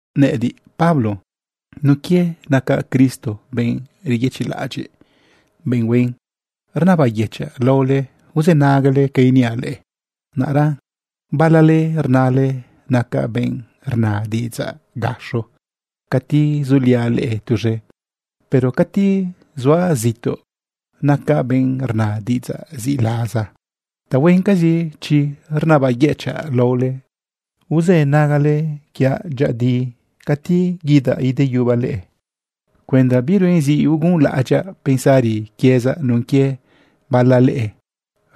Nëꞌëdiꞌ, Pablo, nun quie naca Cristo benꞌ reyëchiꞌlaꞌadyiꞌ, benꞌ huen, rnabayëchaꞌ laole uzënagale ca iniaꞌ leꞌe. Naꞌra bala leꞌe rnale nacaꞌ benꞌ rna diꞌidzaꞌ gaxo cati zuliaꞌ leꞌe tuz̃e, pero cati zuaꞌ zituꞌ, nacaꞌ benꞌ rna diꞌidzaꞌ ziꞌlaza. Tahuencazi chiꞌ, rnabayëchaꞌ laole uzënagale quiaꞌ dyëꞌëdi cati guidaꞌ ideyubaꞌ leꞌe cuenda biruen zi ugunlaꞌadyaꞌ pensari quiezaꞌ nun quie bala leꞌe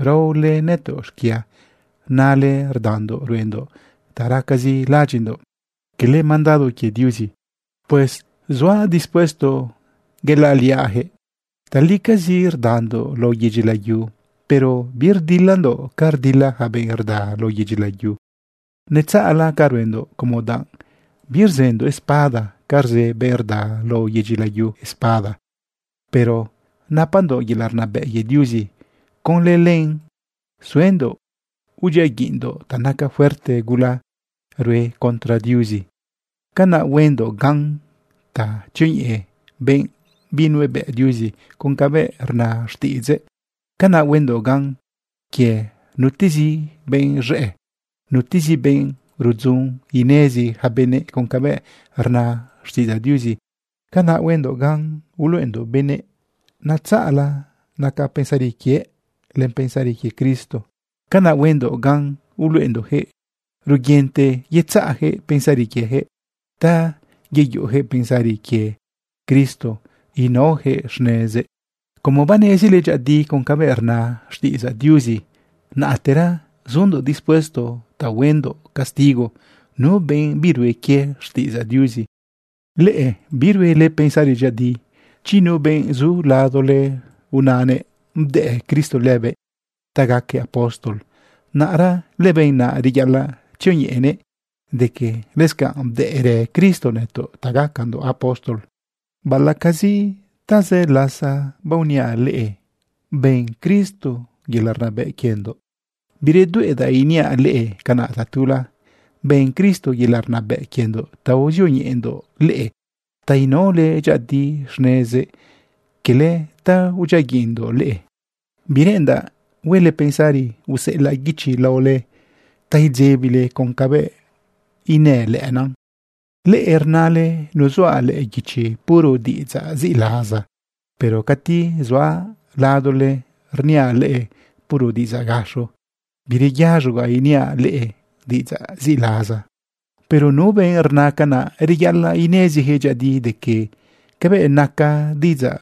raole nëtoꞌ xquia nale rdandoꞌ ruendoꞌ ta racazi laꞌadyiꞌndoꞌ, quele mandado quie Diuzi. Pues zuaꞌ dispuesto yelaꞌliaꞌjëꞌ. Talicazi rdandoꞌ lao yedyi layu, pero birdilandoꞌ ca rdila ja benꞌ rda lao yedyi layu. Netzaꞌla ca ruendoꞌ como danꞌ birzëndoꞌ espada ca rzë benꞌ rda lao yedyi layu espada, pero napandoꞌ yelaꞌ rnabëꞌ quie Diuzi. Conlë len suendoꞌ udyiaguiꞌndoꞌ ta naca fuerte gula rue contra Diuzi. Canaꞌ huendoꞌ gan ta tzioñeꞌe benꞌ binuebëꞌ Diuzi con cabëꞌ rna xtiꞌidzëꞌ. Canaꞌ huendoꞌ gan quie nutezi benꞌ z̃ëꞌ, nutezi benꞌ rudzun inezi ja benëꞌ con cabëꞌ rna xtiꞌidzaꞌ Diuzi. Canaꞌhuendoꞌ gan uluꞌendoꞌ benëꞌ netzaꞌla naca pensari quie len pensari quie Cristo. Canaꞌ huendoꞌ gan uluꞌendoꞌjëꞌ ruguinte yetzaꞌjëꞌ pensari quiejëꞌ ta yeyuꞌujëꞌ pensari quie Cristo inaojëꞌ xnezëꞌ. Como banezile dyëꞌëdi con cabëꞌ rna xtiꞌidzaꞌ Diuzi, naꞌtera zundoꞌ dispuesto ta huendoꞌ castigo nu benꞌ birue quie xtiꞌidzaꞌ Diuzi. Leꞌe biruele pensari dyëꞌëdi. Chi nu benꞌ zu ladole unanëꞌ bdëꞌ Cristo lëbëꞌ ta gaquëꞌ apóstol, naꞌra lëbenꞌ naꞌ reyaꞌalaꞌ tzioñeꞌenëꞌ de que lëscanꞌ bdëꞌrë Cristo nëtoꞌ ta gacandoꞌ apóstol. Laꞌacazi tazë lasa baoniaꞌ leꞌe ben Cristo yelaꞌ rnabëꞌ quiendoꞌ, biredueꞌdaꞌ iniaꞌ leꞌe canaꞌ tatula. Ben Cristo yelaꞌ rnabëꞌ quiendoꞌ ta uzioñeꞌendoꞌ leꞌe ta inaole dyëꞌëdi xnezëꞌ, cala ta udyiaguiꞌndoꞌ leꞌe. Bireꞌendaꞌ huele pensari useꞌelaꞌ guichi laole ta idzebile con cabëꞌ inën lëꞌëna. Leꞌe rnale nuzuaꞌ lëꞌë guichi puro diꞌidzaꞌ ziꞌlaza, pero cati zuaꞌ ladole, rniaꞌ leꞌe puro diꞌidzaꞌ gaxo, bireyaz̃ogaꞌ iniaꞌ leꞌe diꞌidzaꞌ ziꞌlaza. Pero nu benꞌ rna canaꞌ, reyaꞌalaꞌ inezijëꞌ dyëꞌëdi de que cabëꞌ naca diꞌidzaꞌ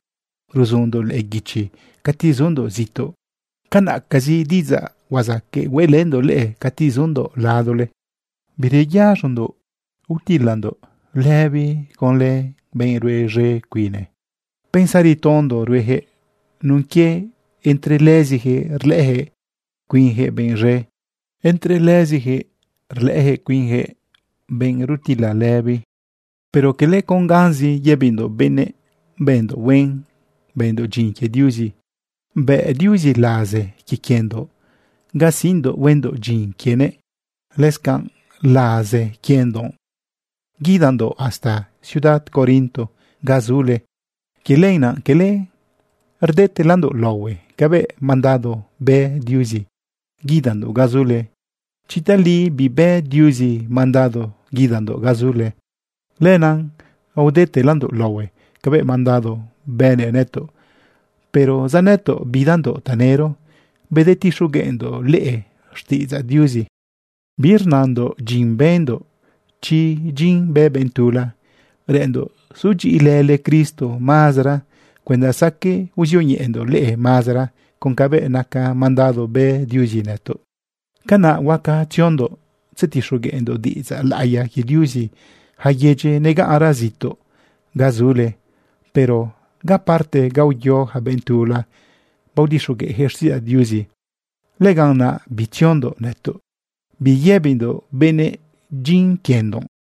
ruzundoꞌlëꞌë guichi cati zundoꞌ zituꞌ, canaꞌcazi diꞌidzaꞌ huazaqueꞌ hueꞌlëndoꞌ leꞌe cati zundoꞌ ladole. Bireyaz̃ondoꞌ utilandoꞌ lëbi conlë lëbenꞌ rue z̃e cuine. Pensari tondo ruejëꞌ nun quie entre lëzijëꞌ rlëꞌëjëꞌ cuinjëꞌ benꞌ z̃e, entre lëzijëꞌ rlëꞌëjëꞌ cuinjëꞌ benꞌ rutila lëbi. Pero cala con ganzi yëbindoꞌ benëꞌ bëndoꞌ huen, bëndoꞌ dyin quie Diuzi. Bëꞌ Diuzi laze quie quiendoꞌ ga siꞌndoꞌ huendoꞌ dyin quienëꞌ. Lëscanꞌ laze quiendoꞌ guidandoꞌ hasta ciudad Corinto ganꞌ zule. Quie lenaꞌ cala rdetelandoꞌ laohue cabëꞌ mandado bë Diuzi guidandoꞌ ganꞌ zule. Chi tali bibë Diuzi mandado guidandoꞌ ganꞌ zule, lenaꞌ aodetelandoꞌ laohue cabëꞌ mandado bënëꞌ nëtoꞌ. Pero zanëtoꞌ bidandoꞌ tanëro bedetixogueꞌndoꞌ leꞌe xtiꞌidzaꞌ Diuzi. Birnandoꞌ dyin bëndoꞌ chi dyin bë benꞌ tula. Reꞌenndoꞌ sudyiꞌilële Cristo mazara cuenda saqueꞌ uzioñeꞌendoꞌ leꞌe mazara con cabëꞌ naca mandado bë Diuzi nëtoꞌ. Canaꞌ huaca tziondoꞌ tzetixogueꞌndoꞌ diꞌidzaꞌ laꞌiya quie Diuzi ja yedyi negaꞌnra zituꞌ ga zule. Pero ga parte ga uyo ja benꞌ tula, baodixogueꞌjëꞌ xtiꞌidzaꞌ Diuzi, lëganꞌ naꞌ bitziondoꞌ nëtoꞌ biyëbindoꞌ benëꞌ dyin quiendoꞌ.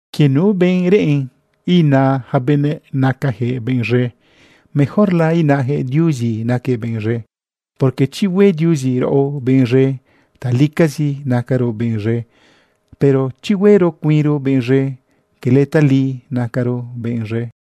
Quie nu benꞌ reꞌen ina ja benëꞌ nacajëꞌ benꞌ z̃e, mejorla inajëꞌ Diuzi naquëꞌ benꞌ z̃e. Porque chi hue Diuzi raꞌo benꞌ z̃e, talicazi nacaro benꞌz̃e, pero chi huero cuinro benꞌ z̃e, cala tali nacaro benꞌ z̃e.